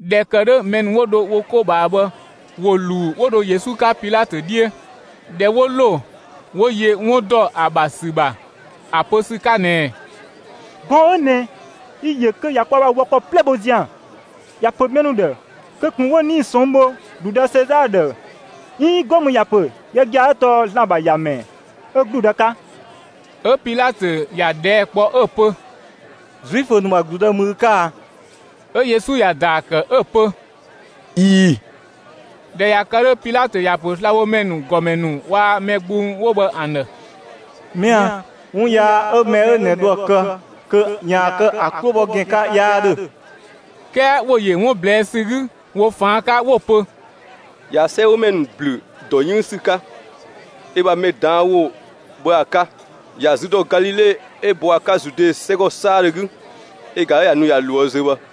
꞊Dhɛ ‑kë 'dhö mɛ ‑nu 'wo dho wo 'ko ꞊bhaa bhë ‑wo ‑luu 'wo dho Yesu 'ka Pilatö 'dhiö. ꞊Dhɛ 'wo ‑lo, 'wo yö 'wun ‑dɔ ‑a ‑bha ‑sü ‑bha ‑a pö ‑sü 'ka ꞊nɛɛ: «Gɔɔn‑ 'ö ꞊nɛ, yi‑ ‑yö kö ꞊ya kwaa‑ wɔ ‑kɔ 'plɛ bho zian; ‑ya ‑pö mɛ ‑nu ‑dhë kö ꞊kun 'wo 'nii‑ ꞊sɔnng' bho ‑gludë Sezaa ‑dhë 'iin 'go mü ‑ya ‑pö yö gia‑ 'ö tɔɔ ‑Zlan ‑bha ‑Yamɛ 'ö ‑gludë 'ka.» 'Ö Pilatö ‑ya ꞊dhɛɛ' kpɔ 'ö‑ pö: «Zuifö ‑nu ‑bha ‑gludë ‑mü ü 'ka a?» 'Ö Yesu ‑ya ‑daa ‑kë 'ö‑ pö: «꞊Ii‑.» ꞊Dhɛ ꞊ya kë 'dhö, Pilatö ‑ya ‑pö slabhomɛ ‑nu ‑gɔmɛ ‑nu waa‑ mɛ gbung 'wo bhë ‑an ‑dhë: «Mɛa‑, 'wun yaa 'ö mɛ 'ö ꞊nɛ dho ‑a kë kö ‑yaan kë ‑a 'klo bhɔ ‑gɛn 'ka 'yaa 'dhö!» 'Kɛɛ ‑wo ‑yö 'wun ꞊blɛɛ' ‑sü 'gü ‑wo ꞊faan' 'ka 'wo‑ pö: «꞊Ya 'sɛgümɛ ‑nu ‑blü dɔ 'yënng ‑sü 'ka ö bha mɛ ꞊daan' ‑wo bhë ‑a 'ka, ‑ya zü ‑dɔ Galile 'ö bɔ ‑a 'ka Zude 'sɛgɔ 'saadhö 'gü, ö ꞊ga 'ö ꞊ya nu ꞊ya ꞊loë' zö bhë.»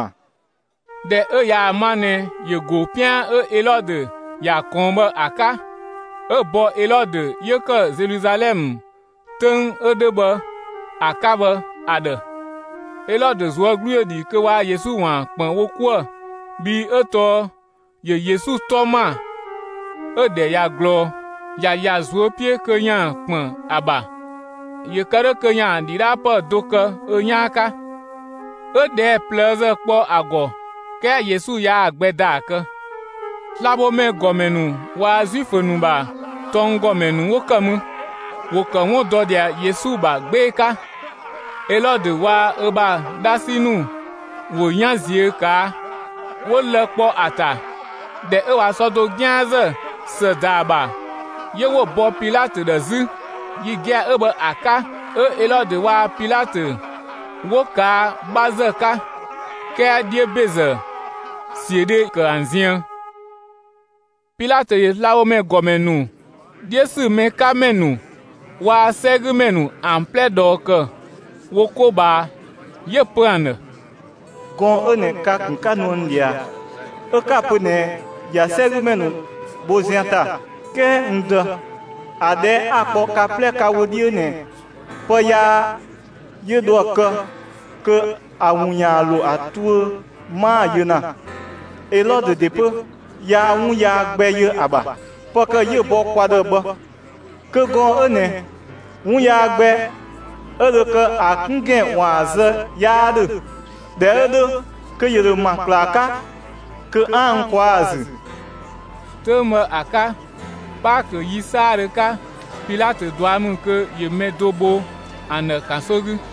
'Ö ꞊dhɛ 'ö ꞊yaa‑ ma ꞊nɛ ‑yö go 'pian 'ö Elɔdö ‑ya ꞊kɔɔn bhë ‑a 'ka, 'ö‑ bɔ Elɔdö 'yö ‑kë Zeluzalɛmë 'töng 'ö 'dhö bhë ‑a 'ka bhë ‑a ‑dhë. Elɔdö ꞊zuö' 'glu ‑yö ‑dhi kö waa‑ Yesu ‑waan ‑kpën wo 'kuë‑, bhii 'ö tɔɔ ‑yö Yesu 'tɔ ‑ma 'ö‑ ‑dhɛ ꞊ya ꞊glɔɔ. ‑Ya ‑ya ꞊zuö' 'piö kö ‑yaan ‑kpën ‑a ‑bha, ‑yö kë 'dhö kö ‑yaan ‑dhidhaapë do kë ö 'yaan 'ka. 'Ö ꞊dhɛɛ' ꞊plëëzë kpɔ ‑a ‑gɔ, 'kɛɛ Yesu yaa‑ gbɛ ‑daa kë. Slabhomɛ ‑gɔmɛ ‑nu waa‑ Zuifö ‑nu ‑bha tɔnggɔmɛ ‑nu 'wo ‑kë mü, ‑wo ‑kë 'wun dɔ ꞊dhia Yesu ‑bha 'gbee‑ 'ka. Elɔdö waa‑ ö bha 'dhasi ‑nu ‑wo 'yan ꞊ziö' ꞊kaa', 'wo lë‑ ‑kpɔ ‑a ‑ta. ꞊Dhɛ 'ö ꞊wa sɔ do 'gianzë ‑së ‑da ‑a ‑bha, 'yö 'wo‑ bɔ Pilatö ‑dhë 'zü. Yi gia‑ 'ö bhë ‑a 'ka, 'ö Elɔdö waa‑ Pilatö 'wo kaa 'bhazë 'ka, 'kɛɛ 'dhiö ‑bezë, ‑siödhe ‑kë ‑an ziën. Pilatö ‑yö slabhomɛ ‑gɔmɛ ‑nu, 'dhiö ‑sü mɛ 'ka ‑mɛ ‑nu, waa‑ 'sɛgümɛ ‑nu ‑an 'plɛ ꞊dhɔɔ ‑kë wo 'ko ꞊bhaa, 'yö‑ pö ‑an ‑dhë: «Gɔɔn‑ 'ö ꞊nɛ ka‑ ‑kun 'ka nuë n ꞊dhia, 'ö 'ka‑ pö ꞊nɛɛ ꞊ya 'sɛgümɛ ‑nu bho zian ‑ta, 'kɛɛ n dë, ‑a ꞊dhɛɛ' 'a‑ ‑kpɔ ka 'plɛ ka wö 'dhiö ꞊nɛ pë yaa 'yö dho ‑a kë kö ‑a ‑wun ‑yaan ‑lo ‑a tuö 'maa‑ yö ‑na. Elɔdö ‑de 'pö yaa 'wun yaa gbɛ yö ‑a ‑bha. Pë ‑kë 'yö‑ bɔ kwa ‑dhë bhë. Kö gɔɔn‑ 'ö ꞊nɛ 'wun yaa gbɛ 'ö dho kë ‑a 'kun ‑gɛn ‑waan zë 'yaa 'dhö. ꞊Dhɛ 'ö 'dhö kö ‑yö ‑dho ‑ma ‑klaa 'ka kö 'aan‑ n ꞊kwaa'‑ ‑a ‑zü.» ['Töng bhë ‑a 'ka, Paakö ‑yi 'saadhö 'ka, Pilatö ꞊dua' ‑mü kö ‑yö mɛ do bho ‑an ‑dhë ‑kanso 'gü.]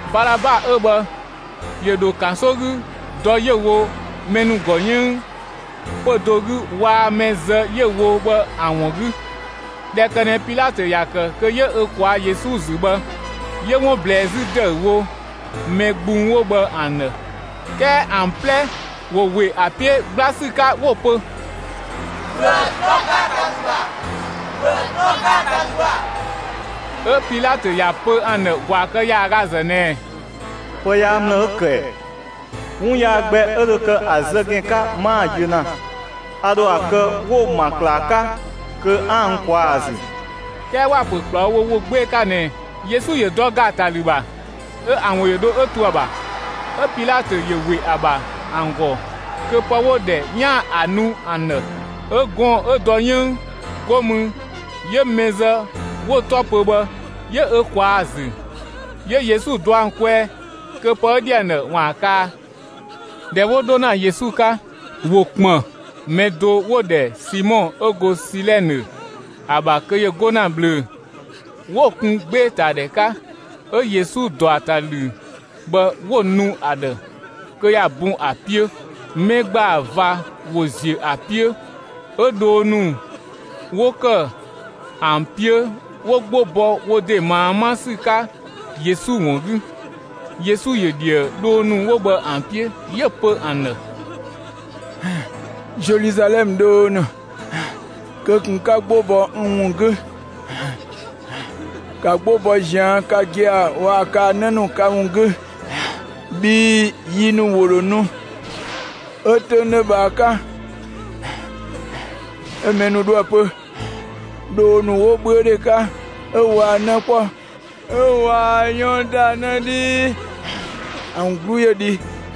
Balaba 'ö bhë ‑yö ‑dho ‑kanso 'gü dɔ 'yö‑ wo mɛ ‑nu ‑gɔ 'yënng pö‑ do 'gü waa‑ mɛ zë 'yö‑ wo bhë ‑an ‑wun 'gü. ꞊Dhɛ kë ꞊nɛ Pilatö ‑ya ‑kë kö 'yö ö ꞊kwaa' Yesu ‑zü bhë, 'yö 'wun ꞊blɛɛ 'zü ‑dëüwo mɛ gbung 'wo bhë ‑an ‑dhë. 'Kɛɛ ‑an 'plɛ ‑wo ‑we ‑a 'piö 'gbla ‑sü 'ka 'wo‑ pö: «‑Bhö ‑a dɔ ‑gaatalü ‑bha! ‑Bhö ‑a dɔ ‑gaatalü ‑bha!» 'Ö Pilatö ‑ya pö ‑an ‑dhë ‑gwaa kë ‑yaagazë ꞊nɛɛ: «Pë yaa ‑mlë 'ö‑ ‑kë ‑ɛ? 'Wun yaa gbɛ 'ö dho kë ‑a zë ‑gɛn 'ka, 'maa‑ yö ‑na. A ‑dho ‑a kë 'wo‑ ‑ma ‑klaa 'ka kö 'aan‑ n ꞊kwaa'‑ ‑zü.» 'Kɛɛ ‑wa ‑pö ‑kplawo wo ‑wo 'gbee‑ 'ka ꞊nɛ Yesu ‑yö dɔ ‑gaatalü ‑bha. 'Ö ‑an ‑wo ‑yö dho 'ö to ‑a ‑bha. 'Ö Pilatö ‑yö ‑we ‑a ‑bha ‑an ‑gɔ kö pë 'wo‑ ‑dhɛ 'yaan‑ ‑a nu ‑an ‑dhë. 'Ö gɔɔn‑ 'ö dɔ 'yënng 'go mü 'yö mɛ zë 'wo‑ 'tɔ pö bhë 'yö ö ꞊kwaa‑ ‑zü, 'yö Yesu dɔ ‑an kwɛɛ kö pë 'yö ‑dhi ‑an ‑dhë ‑waan kaa. ꞊Dhɛ 'wo 'dho ‑na Yesu 'ka, ‑wo ‑kpën mɛ do 'wo‑ ‑dhɛ Simɔ 'ö go Silɛnë ‑a ‑bha kö ‑yö 'go ‑na ꞊bhlöö‑; 'wo‑ kun 'gbeetadhɛ 'ka 'ö Yesu ‑dɔ ‑a ‑ta ‑lü bhë 'wo‑ nu ‑a ‑dhë kö ‑ya bun ‑a 'piö. Mɛ ‑gbaa ꞊va ‑wo ‑ziö ‑a 'piö, 'ö dhoo ‑nu 'wo ‑kë ‑an 'piö 'wo 'gbo bɔ wo ‑de ꞊maa 'ma ‑sü 'ka Yesu ‑wun 'gü. Yesu ‑yö ꞊dhië dhoo ‑nu bhë ‑an 'piö, 'yö‑ pö ‑an ‑dhë: «Zeluzalɛmë dhoo ‑nu, kö ꞊kun 'ka 'gbo bɔ n ‑wun 'gü! ‑Ka 'gbo bɔ ꞊zian' ka gia‑ waa‑ kaa‑ 'në ‑nu ka ‑wun 'gü, bhii yi ‑nu ‑wo ‑dho nu, 'ö 'töng 'dhö bhë ‑a 'ka mɛ ‑nu ‑dhoë pö: ‹Dhoo ‑nu 'wo 'bhüödhe 'ka 'ö waa 'në 'kpɔ 'ö waa 'yɔn ‑da 'në 'dhii ‑an 'glu ‑yö dhi!›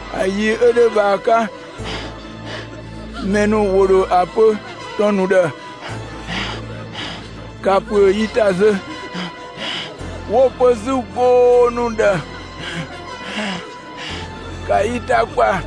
‑A yi 'ö 'dhö bhë ‑a 'ka, mɛ ‑nu ‑wo ‑dho ‑a pö ‑tɔn ‑nu ‑dhë: ‹‑Ka ‑püö yi ‑ta zö!› 'Wo‑ pö 'zü goo ‑nu ‑dhë: ‹‑Ka yi ‑ta ‑kpa!›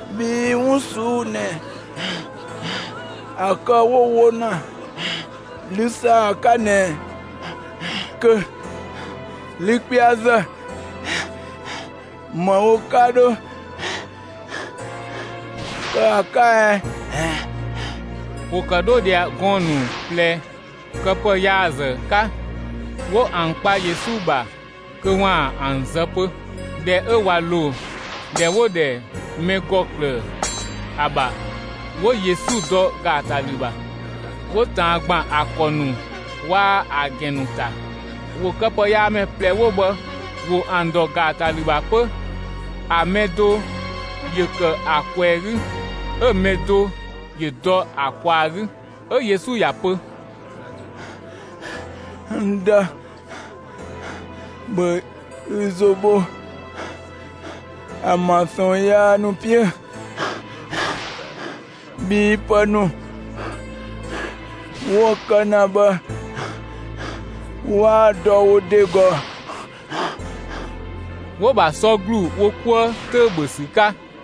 Bhii 'wun ꞊suu'‑ ꞊nɛ ‑a kë 'wo‑ wo ‑na 'lü ‑saa 'ka ꞊nɛ kö 'lü 'kpɛazë, ‑më wo 'ka 'dho kë ‑a 'ka ɛ?» ‑Wo ‑kë 'dho ꞊dhia gɔɔn‑ ‑nu ꞊plɛ këpëyaazë 'ka, 'wo ‑an kpa Yesu ‑bha kö ‑waan ‑an zë 'pö. ꞊Dhɛ 'ö ꞊wa ‑lo ‑dhɛ 'wo‑ ‑dhɛ «mɛ ‑gɔ ‑klëë» ‑a ‑bha, 'wo Yesu dɔ ‑gaatalü ‑bha, 'wo ꞊taan ‑gban ‑a ‑kɔ ‑nu waa‑ ‑a ‑gɛn ‑nu ‑ta. ‑Wo këpëyaamɛ ꞊plɛ 'wo bhë ‑wo ‑an ‑dɔ ‑gaatalü ‑bha 'pö, ‑a mɛ do ‑yö ‑kë ‑a ꞊kwɛɛ‑ 'gü, 'ö‑ mɛ do ‑yö dɔ ‑a ꞊kwaa‑ 'gü. 'Ö Yesu ‑ya pö: «N Dë, ‑bhö ü ‑zo bho ‑an ‑bha ꞊sɔɔn yaa ‑nu 'piö, bhii pë ‑nu 'wo‑ kë ‑na bhë 'waa‑ dɔ wo ‑de ‑gɔ.» 'Wo‑ ‑bha sɔ ‑glu wo 'kuë 'töü‑ ‑bhö ‑sü 'ka.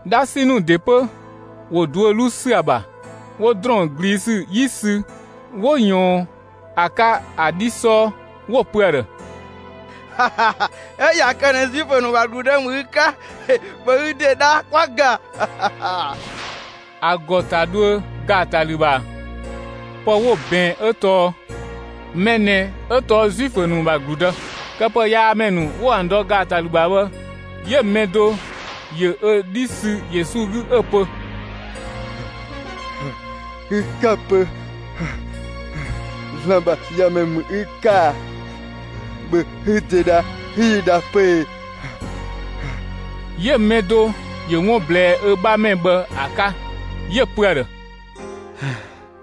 'Dhasi ‑nu ‑de 'pö ‑wo duö 'luu ‑sü ‑a ‑bha, 'wo ‑drɔɔn ꞊gliisü 'yi sü 'wo ꞊yɔɔn ‑a 'ka, ‑a 'dhi 'sɔɔ, 'wo‑ pö ‑a ‑dhë: «'Ö ꞊ya kë ꞊nɛ Zuifö ‑nu ‑bha ‑gludë ‑mü ü 'ka, ‑bhö ü ‑de dha 'kwa‑ ‑ga!» ‑A ‑gɔ ‑ta dhuö ‑gaatalü ‑bha, pë 'wo‑ ꞊bɛɛn 'ö tɔɔ: «Mɛ ꞊nɛ 'ö tɔɔ Zuifö ‑nu ‑bha ‑gludë». Këpëyaamɛ ‑nu 'wo ‑an dɔ ‑gaatalü ‑bha bhë 'yö‑ mɛ do ‑yö ö 'dhi sü Yesu 'gü 'ö‑ pö: «Ü 'ka‑ pö ‑Zlan ‑bha ‑Yamɛ ‑mü ü 'ka a? ‑Bhö ü ‑de dha 'ü yi dha 'pö ee!» 'Yö‑ mɛ do ‑yö 'wun ‑blɛɛ ö 'bhamɛ bhë ‑a 'ka 'yö‑ pö ‑a ‑dhë: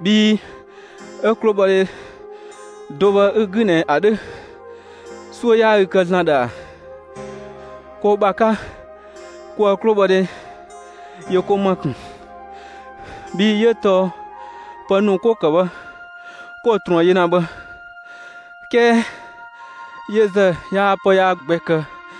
«Bhi 'ö 'klobhɔdhe do bhë 'ü‑ 'gü ꞊nɛ ‑a 'dhö, 'suö 'yaa ü kë ‑Zlan ‑dhë ‑a? Ko ‑bha 'ka, koë‑ 'klobhɔdhe ‑yö ko ‑ma ‑kun, bhii 'ö tɔɔ pë ‑nu 'ko‑ ‑kë bhë 'ko‑ ꞊truën yö ‑na bhë; 'kɛɛ yö ‑zë, yaa pë yaa gbɛ kë.»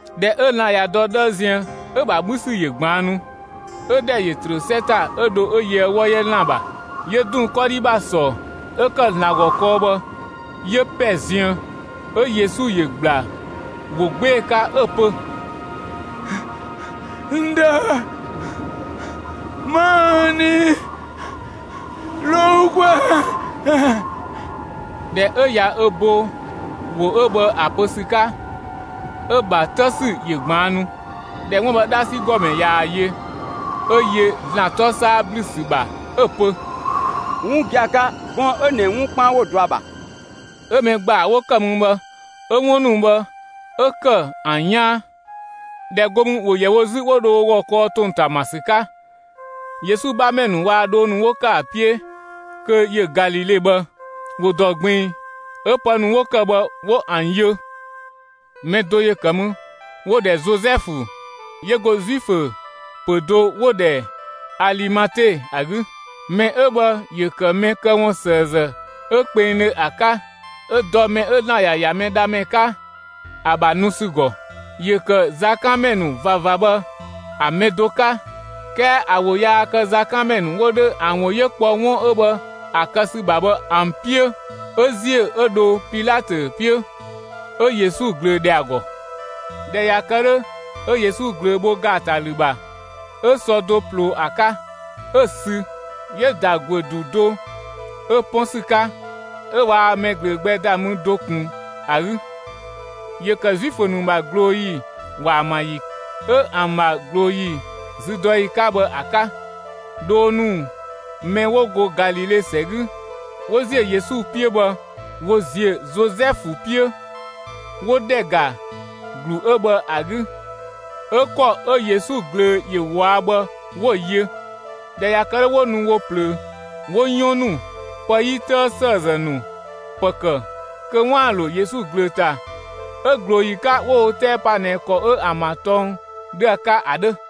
꞊Dhɛ 'ö lan‑ ꞊ya dɔ 'dhëë ziën, 'ö‑ ‑bha 'bhü ‑sü ‑yö ꞊gbaannu, 'ö ‑dhɛ ‑yö ‑trö 'sɛ ‑ta 'ö dho 'ö yöë 'wɔ 'yɛ ‑lan ‑bha; 'yö ‑dun 'kɔdhi ‑bha ‑sɔ 'ö ‑kë ‑Zlan ‑gɔ kɔɔ bhë 'yö ‑pɛ ziën. 'Ö Yesu ‑yö ‑gbla ‑wo 'gbee‑ 'ka 'ö‑ pö: «N Dë, 'ma n nii ‑lo ü kwɛɛ!» ꞊Dhɛ 'ö ꞊ya ö bo ‑wo 'ö bhë ‑a pö ‑sü 'ka, 'ö‑ ‑bha 'të ‑sü ‑yö ꞊gbaannu. ꞊Dhɛ 'wun bhë 'dhasi ‑gɔmɛ ꞊yaa‑ yö, 'ö yö ‑Zlan 'tɔ 'saa ‑blü ‑sü ‑bha 'ö‑ pö: «'Wun gia‑ 'ka, gɔɔn‑ 'ö ꞊nɛ 'wun 'kpaan 'wo‑ dɔ ‑a ‑bha!» 'Ö mɛ ‑gbaa 'wo kë mü bhë 'ö 'wun ‑nu bhë 'ö ‑kë ‑an 'yaan. ꞊Dhɛ 'go mü, ‑wo ‑yɛ wo 'zü 'wo dho wo ‑gɔ kɔɔ wo ‑tong ‑ta ‑ma ‑sü 'ka. Yesu 'bhamɛ ‑nu waa‑ dhoo ‑nu 'wo ‑kë ‑a 'piö kö ‑yö Galile bhë, ‑wo ‑dɔ ꞊gbiin 'ö pë ‑nu 'wo ‑kë bhë 'wo ‑an yö. Mɛ do ‑yö ‑kë mü, 'wo‑ ‑dhɛ Zozɛfu 'yö go Zuifö ‑pö do 'wo‑ ‑dhɛ Alimate ‑a 'gü. Mɛ 'ö bhë ‑yö ‑kë mɛ këwunsëëzë 'ö kpengdhö ‑a 'ka 'ö dɔ mɛ 'ö ‑Zlan ‑ya ‑ya Mɛdhamɛ 'ka, ‑a ‑bha nu ‑sü ‑gɔ. ‑Yö ‑kë zakanmɛ ‑nu ꞊vava bhë ‑an mɛ do 'ka, 'kɛɛ ‑a ‑wo yaa kë zakanmɛ ‑nu 'wo 'dhö ‑an ‑wo 'yö kpɔ 'wun 'ö bhë ‑a kë ‑sü ‑bha bhë ‑an 'piö. 'Ö ‑ziö 'ö dho Pilatö 'piö, 'ö Yesu ꞊glöö ‑dhɛ ‑a ‑gɔ. ꞊Dhɛ ꞊ya kë 'dhö, 'ö Yesu ꞊glöö bho ‑gaatalü ‑bha, 'ö sɔ do ꞊ploo ‑a 'ka 'ö‑ sü 'yö‑ ‑da ‑guö ‑du do 'ö 'pɔn ‑sü 'ka, 'ö waa mɛ ꞊glöö gbɛ ‑da mü do ꞊kun ‑a 'gü. ‑Yö ‑kë Zuifö ‑nu ‑bha ꞊glooyi ‑waamayi 'ö ‑an ‑bha ꞊glooyi züdɔyi 'ka bhë ‑a 'ka. Dhoo ‑nu mɛ 'wo go Galile ‑sɛ 'gü 'wo ‑ziö Yesu 'piö bhë, ‑wo ‑ziö Zozɛfu 'piö, 'wo ‑dhɛ ‑ga ‑glu 'ö bhë ‑a 'gü, 'ö ‑kɔ 'ö Yesu ꞊glöö ‑yö ꞊wɔa' bhë 'wo‑ yö. ꞊Dhɛ ꞊ya kë 'dhö, 'wo nu wo ꞊plöö 'wo 'yɔn ‑nu, pë 'yi 'tëë ‑sëëzë ‑nu ‑pë ‑kë kö 'waan‑ ‑lo Yesu ꞊glöö ‑ta. 'Ö ꞊glooyi 'ka 'wo wo 'tɛɛ pa ꞊nɛ ‑kɔ 'ö ‑an ‑bha tɔng 'dhö ‑a 'ka ‑a 'dhö.